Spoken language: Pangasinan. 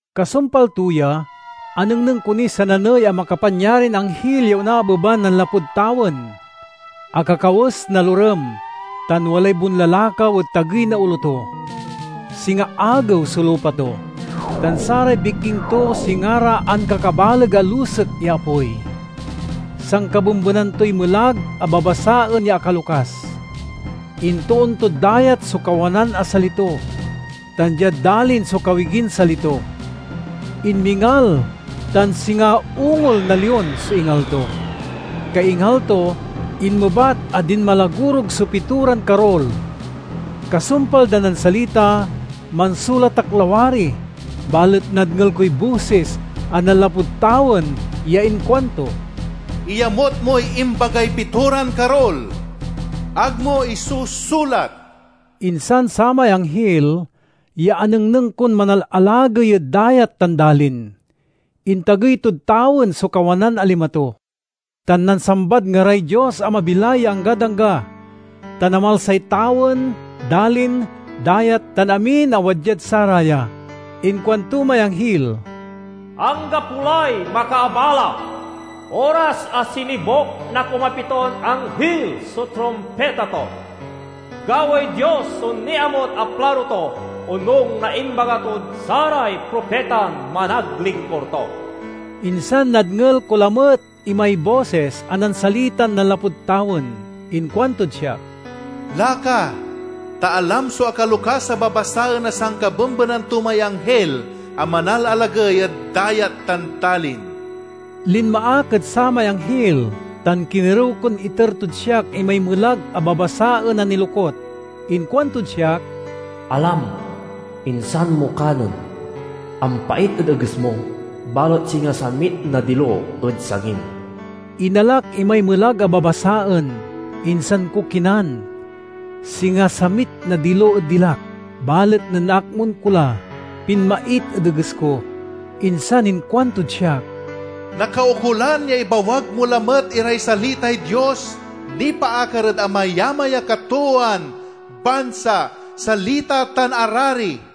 Kasumpal to ya, anengneng ko niy sananey a makapanyarin anghil ya onaabeban nanlapud tawen. Akakawes na lorem, tan walay bonlalakaw ed tagey na olo to. Singa agew so lupa to, tan saray bikking to singa ra ankakabaleg a lusek ya apoy. Sankabembenan toy melag a babasaen ya akalokas. Intoon tod dayat so kawanan a sali to, tan diad dalin so kawigin sali to. Inmingal, tan singa ungol na lion so ingal to. Kaingal to, inmebat a dinmalagorug so pitoran karul. Kasumpal dan nansalita, mansulat ak lawari, balet nadngel koy bosis a nanlapud tawen ya inkuanto, "Iyamut moy imbagay pitoran karul; ag mo isusulat!" Insan samay anghil, ya anengneng kon manalalagey ed dayat tan dalin, intagey tod tawen so kawanan a lima to, tan nansambad ngaray Dios a mabilay ya anggad angga, tan amalsay tawen, dalin, dayat, tan amin a wadyad saraya. Inkuanto may anghil, "Anggapo lay makaabala! Oras a sinibuk na kumapiton anghil so trumpita to, gawaey Dios so niamut a plano to, onung na imbaga tod saray propitan managlingkur to." Insan nadngel ko lamet imay bosis a nansalitan nanlapud tawen. Inkuantod siak, "Laka, ta alam so akalokas a babasaen a sankabembenan to may anghil a manalalagey ed dayat tan dalin." Linma ak ed samay anghil tan kinerew kon iter tod siak imay melag a babasaen a nilokut. Inkuantod siak, "Alam, insan mo kanen. Ampait ed eges mo, balet singa samit na dilo ed sangim." Inalak imay melag a babasaen, insan ko kinan. Singa samit na dilo ed dilak, balet nen naakmun ko la, pinmait ed eges ko. Insan inkuantod siak, "Nakaukolan ya ibawag mo lamet iray salitay Dios nipaakar ed amayamay a katoowan, bansa, salita, tan arari."